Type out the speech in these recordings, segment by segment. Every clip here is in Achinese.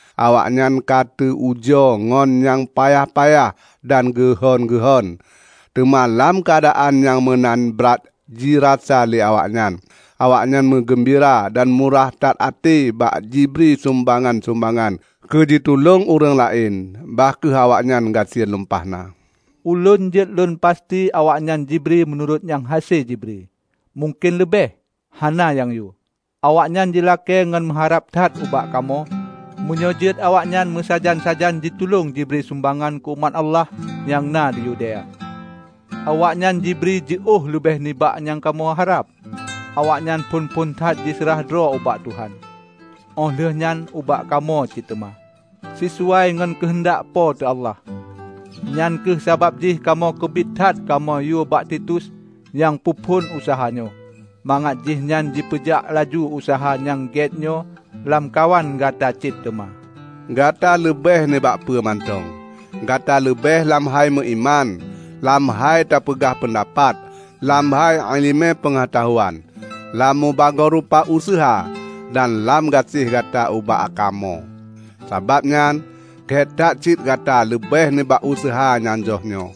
Awaknyan ka teu ujoe ngon nyang payah-payah dan geuhon-geuhon. Teuma lam keuadaan nyang meunan brat jirasa lé awaknyan, awaknyan meugeumbira dan murah that até bak jibri sumbangan-sumbangan keujitulông ureuëng laén, bah kheueh awaknyan gasien lumpah na. Ulôn jeuet lôn pasti awaknyan jibri meunurot nyang hase jibri, mungken leubeh. Hana nyang yue, awaknyan jilakée ngon meuharab that ubak kamoe meunyoe jeuet awaknyan meusajan-sajan jitulông jibri sumbangan keu umat Allah nyang na di Yudea. Awaknyan jibri jiôh leubeh nibak nyang kamoe harab. Awaknyan phon-phon that jiseurah droe ubak Tuhan, óh lheueh nyan ubak kamoe cit teuma, sisuai ngon keuheundak Po teu Allah. Nyang kheueh sabab jih kamoe keubiet that kamoe yue bak Titus -- nyang peuphon useuha nyoe -- mangat jihnyan jipeujak laju useuha nyang gét nyoe lamkawan gata cit teuma. Gata leubeh nibak peue mantong: Gata leubeh lam hai meuiman, lam hai tapeugah peundapat, lam hai iéleumé peungeutahuan, lam mubagoe rupa useuha, dan lam gaséh gata ubak kamoe. Sabab nyan, gét that cit gata leubeh nibak useuha nyang jroh nyoe.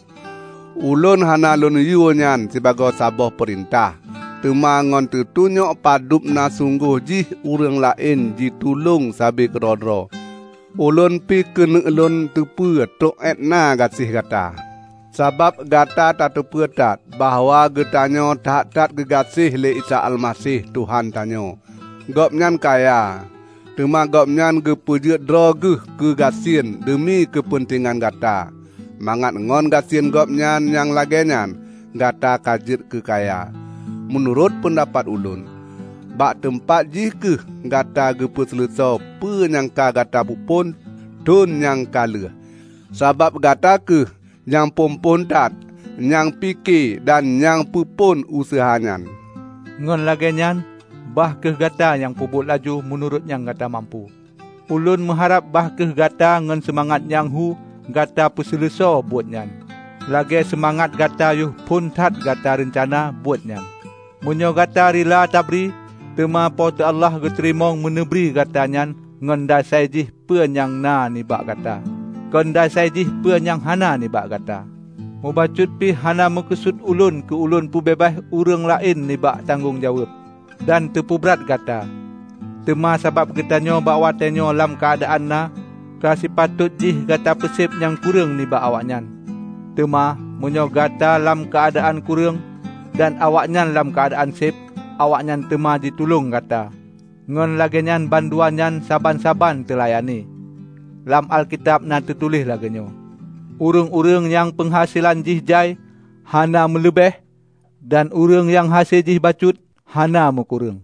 Ulôn hana lôn yue nyan sibagoe saboh peurintah. Teuma ngon teutunyok padub na sunggoh jih ureuëng laén jitulông sabe keudroe-droe, ulôn pih keuneuk lôn teupeu trok éutna gaséh gata. Sabab gata tateupeue that bahwa geutanyoe that-that geugaséh lé Isa Almaseh Tuhan tanyoe. Gobnyan kaya, teuma Gobnyan geupeujeuet droe geuh keugasien deumi keupeuntengan gata, mangat ngon gasien Gobnyan nyang lagée nyan, gata ka jeuet keukaya. Meunurot peundapat ulôn, bak teumpat jih kheueh gata peuseuleusoe peue nyang ka gata peuphon thon nyang ka lheueh. Sabab gata kheueh nyang phon-phon that nyang pike dan nyang peuphon useuha nyan. Ngon lagée nyan, bah kheueh gata nyang peubuet laju meunurot nyang gata mampu. Ulôn meuharab bah kheueh gata ngon seumangat nyang hu gata peuseuleusoe buet nyan, lagée seumangat gata yoh phon that gata reuncana buet nyan. Meunyoe gata rila tabri, teuma Po teu Allah geuteurimong meuneubri gata nyan ngon dasai jih peue nyang na nibak gata, kon dasai jih peue nyang hana nibak gata. Mubacut pih hana meukeusut ulôn keu lôn peubeubaih ureuëng laén nibak tanggong jaweueb, dan teupeubrat gata. Teuma sabab gatanyoe bak watée nyoe lam keuadaan na, ka sipatot jih gata peuseb nyang kureueng nibak awaknyan. Teuma, meunyoe gata lam keuadaan kureueng, dan awaknyan lam keuadaan seb, awaknyan teuma jitulông gata. Ngon lagée nyan bandua nyan saban-saban teulayani. Lam Alkitab na teutuléh lagée nyoe, "Ureuëng-ureuëng nyang peunghaselan jih jai, hana meuleubeh, dan ureuëng nyang hase jih bacut, hana meukureueng."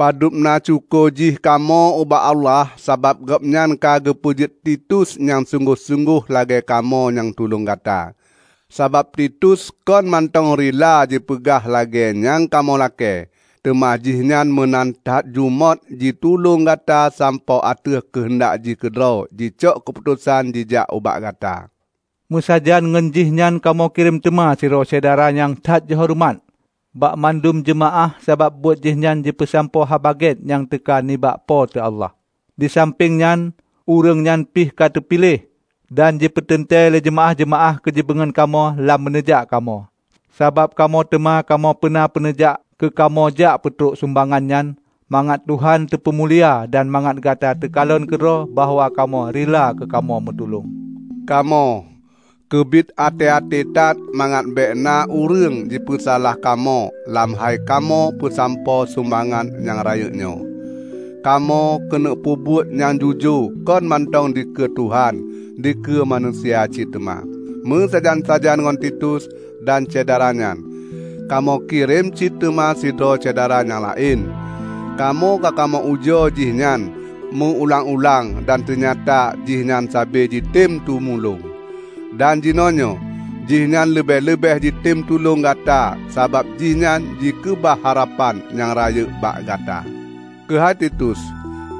Padub na syukoe jih kamoe ubak Allah sabab Gobnyan ka geupeujeuet Titus nyang sunggoh-sunggoh lagée kamoe nyang tulông gata! Sabab Titus kon mantong rila jipeupeunoh lagée nyang kamoe lakée, teuma jihnyan meunan that jumôt jitulông gata sampoe ateueh keuheundak jih keudroe jicok keuputosan jijak ubak gata. Meusajan ngon jihnyan kamoe kirém teuma sidroe syedara nyang that jihoreumat bak mandum jeumaáh sabab buet jihnyan jipeusampoe Haba Gét nyang teuka nibak Po teu Allah. Disampéng nyan, ureuëng nyan pih ka teupiléh dan jipeuteuntée lé jeumaáh-jeumaáh keujipeungon kamoe lam meuneujak kamoe. Sabab kamoe teuma kamoe peuna meuneujak keukamoe jak peutrok sumbangan nyan, mangat Tuhan teupeumulia dan mangat gata takalon keudroe bahwa kamoe rila kamoe meutulông. Kamoe keubiet até-até that mangat bék na ureuëng jipeusalah kamoe lam hai kamoe peusampoe sumbangan nyang rayeuk nyoe. Kamoe keuneuk peubuet nyang jujoe kon mantong dikeue Tuhan, dikeue manusia cit teuma. Meusajan-sajan ngon Titus dan syedara nyan, kamoe kirém cit teuma sidroe syedara nyang laén. Kamoe ka kamoe ujoe jih nyan meu-ulang-ulang dan teunyata jihnyan sabe jitem tumulông. Dan jinoenyoe, jihnyan leubeh-leubeh jitem tulông gata sabab jihnyan jikeubah harapan nyang rayeuk bak gata. Keuhai Titus,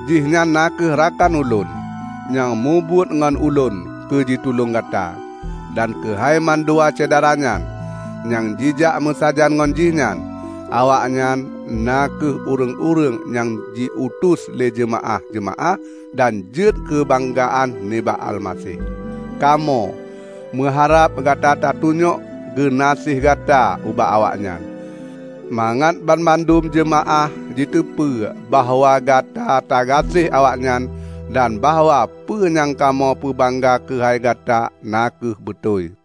jihnyan na kheueh rakan ulôn, nyang mubuet ngon ulôn keu jitulông gata. Dan keuhai mandua syedara nyan, nyang jijak meusajan ngon jihnyan, awaknyan na kheueh ureuëng-ureuëng nyang jiutus lé jeumaáh-jeumaáh dan jeuet keu banggaan nibak Almaseh. Kamoe meuharab gata tatunyok geunaséh gata ubak awaknyan, mangat banmandum jeumaáh jiteupeu bahwa gata tagaséh awaknyan dan bahwa peue nyang kamoe peubangga keuhai gata na kheueh beutôi.